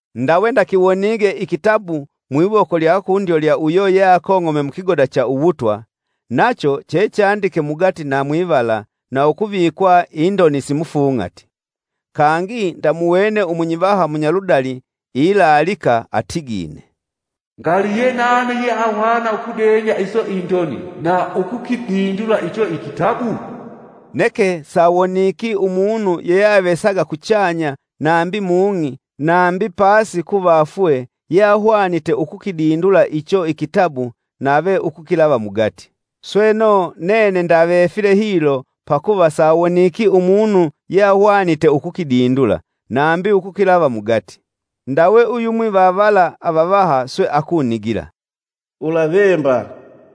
Ndawe ndakiwonige ikitabu mwiwoko lya kundyo lya uyo yeakong'ome mukigoda cha uwutwa; nacho chechandike mugati na mwivala na ukuvikwa indoni simufung'ati. Kangi ndamuwene umunyivaha munyaludali ilaalika atigine: “Ngali yenani yeahwana iso indoni na ukukidindula icho ikitabu?” Neke sawoniki umunu yeyeavesaga kuchanya, nambi mung'i, nambi pasi kuvafwe, yeahwanite ukukidindula icho ikitabu nave ukukilava mugati. Sweno, nene ndavefile hilo pakuva sawoniki umunu yeahwanite ukukidindula, nambi ukukilava mugati. Ndawe uyumwi va vala avavaha swe akunigila, “Ulavemba!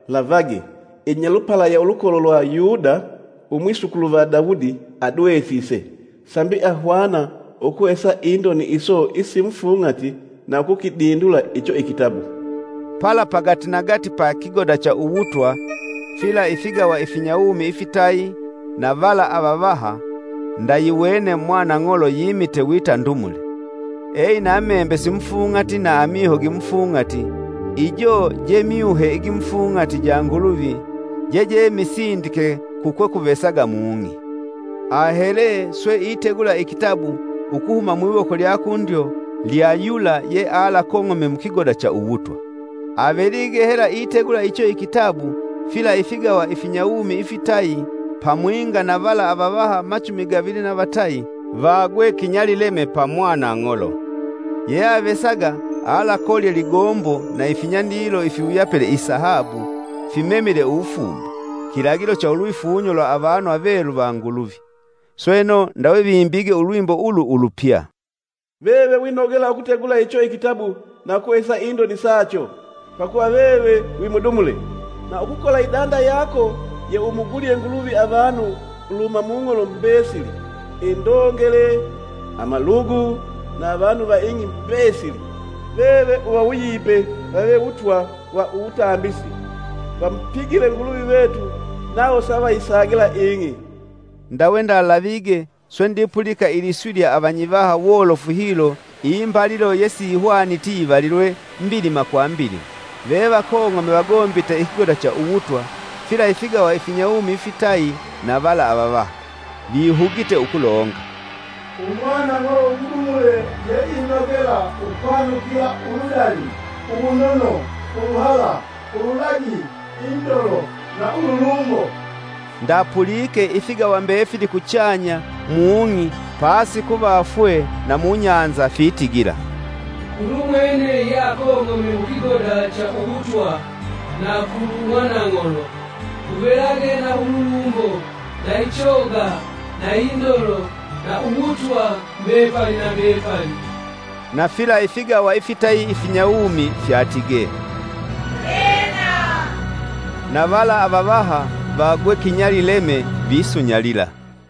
Lavage! Inyalupala ya ulukolo lwa Yuda, umwisukulu va Daudi adwesise. Sambi ahwana ukuhesa indoni iso isimufung'ati na ukukidindula icho ikitabu.” Pala pagatinagati pa kigoda cha uwutwa fila ifigawa ifinyawumi ifitayi, na vala avavaha ndayiwene mwana ng'olo yimite wita ndumule. Eina membe simufung'ati na amiho gimufung'ati ijo je myuhe igimufung'ati ja Nguluvi jeje misindike kukwekuvesaga mung'i, ahele swe itegula ikitabu ukuhuma mwiwoko lya kundyo lya yula yealakong'ome mukigoda cha uwutwa. Avelige hela itegula icho ikitabu, fila ifigawa ifinyawumi ifitayi pamwinga na vala avavaha machumi gavili na vatayi vaagwe kinyalileme pa ng'olo. Yeyeavesaga alakolye ligombo na ifinyandilo ifiwuyapile isahabu fimemile uwufumba, kilagilo cha ulwifunyo lwa avanu avelu va Nguluvi. Sweno, ndawe vimbige ulwimbo ulu ulupya: “Veve winogela ukutegula icho ikitabu na ukuhesa indoni sacho. Pakuva veve wimudumule, na ukukola idanda yako yeumugulye Nguluvi avanu uluhuma mung'olo mbesili, indongele, amalugu, na avanu va ing'i mbesili. Veve uvawuyipe vave wutwa wa uwutambisi vamupigile Nguluvi vetu nawo savayisagila ing'i.” Ndawe ndalavige, swe ndipulika iliswi lya avanyivaha wolofu hilo imbalilo yesihwaniti yivalilwe, mbilima kwa mbilima. Vevakong'ome vagombite ikigoda cha uwutwa, fila ifigawa ifinyawumi ifitayi na vala avavaha; Vihugite ukulonga: “Umwanang'olo umudumule yeinogela ukwanukila uludali, uwunono, uluhala, ululagi, indolo na ululumbo.” Ndapulike ifigawa mbefili kuchanya; mung'i, pasi kuvafwe, na mubahali fitigila, “Kulumwene yeakong'ome mukigoda cha uwutwa, na kulu mwanang'olo, kuvelage na ululumbo na ichoga na indolo na uwutwa mbepali na mbepali.” Na fila ifigawa ifitayi ifinyawumi fyatige, “Ena!” Na vala avavaha vaagwe kinyalileme, visunyalila.